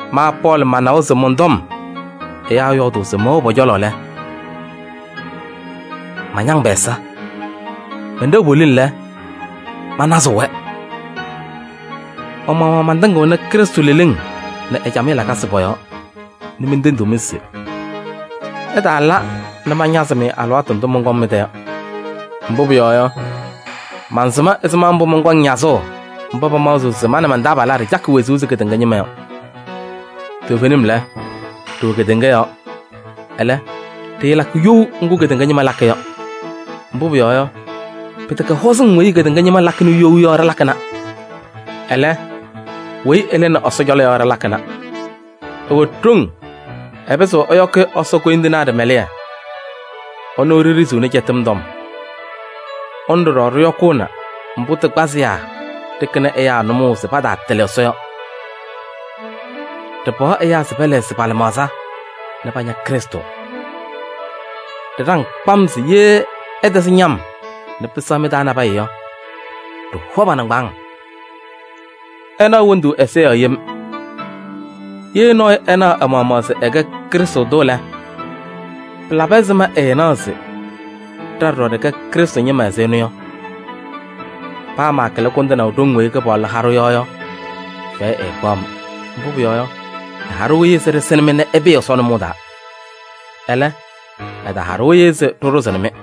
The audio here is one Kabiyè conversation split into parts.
Ma Pɔɔlɩ manawa se mɔn-tɔm ɛyaa yɔɔdʋʋ se mɛwɛɣ pɔ-cɔlɔ lɛ, mañaŋ pɛ-ɛza. Mɛnɖɛɣ poliŋ lɛ, mañazɩɣ-wɛ. Ma-maɣmaɣ mantɩŋɩɣnɩ Krɩstʋ leleŋ nɛ ɛ-camɩyɛ lakasɩ pɔ-yɔɔ nɛ mentendiɣ-mɩ se: ɩtaala nɛ mañazɩ-mɩ alɩwaatʋ ndʋ mɔnkɔŋ mɩ-tɛ yɔ. Mbʋ pʋyɔɔ yɔ, mansɩm ɛzɩma mbʋ mɔnkɔŋ ñazʋʋ mba pamaɣzɩɣ se ma nɛ man-taabalaa ɖɩcakɩ wezuu ɛzɩ kedeŋa ñɩma yɔ. Toovenim lɛ, ɖɩwɛ kedeŋa yɔɔ, ɛlɛ, ɖɩɩlakɩ you ŋgʋ kedeŋa ñɩma lakɩ yɔ. Mbʋ pʋyɔɔ yɔ, pɩtɛkɛ hɔzɩŋ weyi kedeŋa ñɩma lakɩnɩ you yɔ ɖɩlakɩna. Ɛlɛ, weyi ɩlɩnɩ Ɛsɔ cɔlɔ yɔ ɖɩlakɩna. Ɩwɛ ɖoŋ, ɩpɩzɩɣ ɛyɔkɩ Ɛsɔ koyindinaa ɖɩmɛlɩyɛ. Ɩnʋ ɖiɖiziɣni cɛtɩm tɔm. Ɩnʋ ɖɔɖɔ ɖɩyɔkʋʋnɩ mbʋ tɩ kpazɩyaa ɖɩkɩnɩ ɛyaa nʋmɔʋ se pataatɩlɩ Ɛsɔ yɔ. Ɖɩpaɣ ɛyaa se pɛlɛɣzɩ pa-lɩmaɣza nɛ paña Krɩstʋ. Ɖɩɖaŋ kpam se ye ɩtɛzɩ ñam nɛ pɩsɛɣ mɩ-taa nabɛyɛ yɔ, ɖɩhɔ pa-nɩŋgbaaŋ. Ɩnaɣ wondu ɛza yɔɔ yem. Ye nɔɔyʋ ɛna ɛ-maɣmaɣ se ɛkɛ Krɩstʋ tʋ lɛ, pɩlabɩ ɛzɩma ɛɛnaɣ se: ɖa ɖɔɖɔ ɖɩkɛ Krɩstʋ ñɩma ɛzɩ ɛnʋ yɔ? Paa maakɩlɩ kʋndɩnaʋ ɖoŋ weyi Kɩpaɣlʋ ha-ɖʋ yɔ yɔ, fɛyɛ ɛɛkpaɣ-m. Mbʋ pʋyɔɔ yɔ, ɛha-ɖʋ-ɩ se ɖɩsɩnɩ-mɩ nɛ ɩpɩɩ Ɛsɔ nʋmɔʋ taa. Ɛlɛ, ɛtaha-ɖʋ-ɩ se ɖɩɖʋzɩnɩ-mɩ.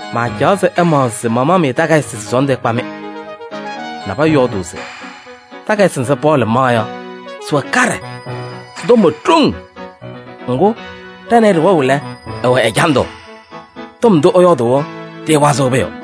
Maacaɣ se ɩmaɣzɩ se mamaɣ-mɩ takayɩsɩ se sɔɔndʋ ɛkpa-mɩ. Nabɛyɛ yɔɔdʋʋ se: “Takayɩsɩ nzɩ Pɔɔlɩ maɣ yɔ sɩwɛ kaɖɛ, sɩ-tɔm wɛ ɖoŋ. Ŋgʋ ɖa nɛ ɩ ɖɩwɛɣ lɛ, ɛwɛ ɛjandʋ, tɔm ndʋ ɛyɔɔdʋʋ yɔ tɩɩwazɩɣ pʋyʋ.”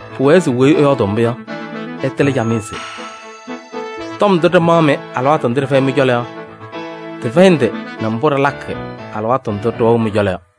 Pʋwɛɛ se weyi ɛyɔɔdʋʋ mbʋ yɔ, ɛtɩlɩ camɩyɛ se: tɔm ndʋ ɖɩmaɣ-mɩ alɩwaatʋ ndʋ ɖɩfɛyɩ mɩ-cɔlɔ yɔ, tɩfɛyɩ ndɩ nɛ mbʋ ɖɩlakɩ alɩwaatʋ ndʋ ɖɩwɛɣ mɩ-cɔlɔ yɔ.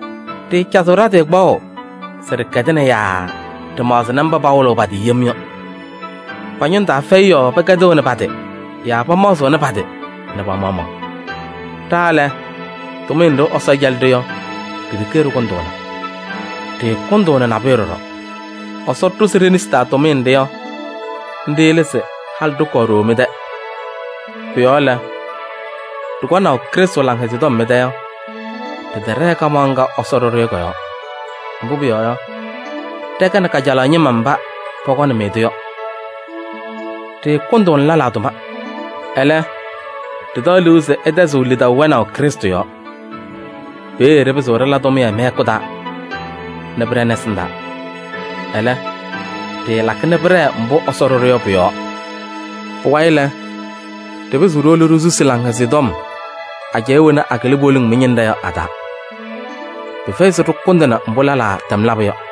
Ɖɩɩcazɩɣ ɖa-tɩ kpaɣʋ se ɖɩkɛdɩna yaa ɖɩmaɣzɩnɩ mba pawɩlɩɣ pa-tɩ yem yɔ. Pa-ñʋŋ taa fɛyɩ yɔɔ pɛkɛdɩɣnɩ pa-tɩ yaa pamaɣzɩɣnɩ pa-tɩ nɛ pa-maɣmaɣ. Ɖa lɛ, tʋmɩyɛ nɖɩ Ɛsɔ cɛlɩ-ɖʋ yɔ, ɖi-ɖeke ɖɩkʋndʋʋna. Ɖɩɩkʋndʋʋnɩ nabʋyʋ ɖɔɖɔ. Ɛsɔ ɖʋzɩ ɖe-nesi taa tʋmɩyɛ nɖɩ yɔ, nɖɩ lɛ se halɩ ɖɩkɔɔ ɖooo mɩ-tɛ. Pʋ-yɔɔ lɛ, ɖɩkɔnaʋ Krɩstʋ Laŋhɛzɩyɛ Tɔm mɩ-tɛ yɔ, ɖɩtɛɖɛɛ kamaɣ ŋga Ɛsɔ ɖʋ-ɖʋ yɔ kɔ-yɔɔ. Mbʋ pʋyɔɔ yɔ, ɖɛkɛnɩ kajalaɣ ñɩma mba pɔkɔnɩ-mɩ-tʋ yɔ. Ɖɩɩkʋndʋʋnɩ lɛlaa tʋma. Ɛlɛ, ɖɩtaɣ liu se ɩtɛzɩɣ lidaʋ wɛnaʋ Krɩstʋ yɔɔ. Peeye ɖɩpɩzɩɣ ɖɩla tʋmɩyɛ mɩ-hɛkʋ taa nɛ pɩɖɛnɩ ɛsɩndaa. Ɛlɛ, ɖɩɩlakɩ nɛ pɩɖɛɛ mbʋ Ɛsɔ ɖʋ-ɖʋ yɔ pʋ-yɔɔ. Pʋwayɩ lɛ, ɖɩpɩzɩɣ ɖiwolo ɖisusi Laŋhɛzɩyɛ Tɔm ajɛɛ wɛna akɩlɩ poliŋ mɩ-ñɩnɖɛ yɔ a-taa. Pɩfɛyɩ se ɖɩkʋndɩnɩ mbʋ lɛlaa tɛm labʋ yɔ.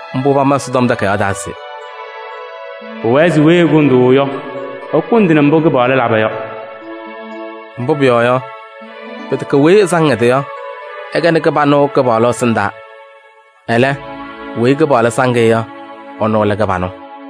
Mbʋ pama Ɛsɔtɔm Takayaɣ taa se: “Pʋwɛɛ se weyi ɛkʋndʋʋ yɔ, ɛkʋndɩnɩ mbʋ Kɩpaɣlʋ laba yɔ.” Mbʋ pʋyɔɔ yɔ, pɩtɛkɛ weyi ɛsaŋ ɛ-tɩ yɔ, ɛkɛnɩ kɩbanʋ Kɩpaɣlʋ ɛsɩndaa. Ɛlɛ, weyi Kɩpaɣlʋ saŋ-ɩ yɔ, ɛnʋ lɛ kɩbanʋ.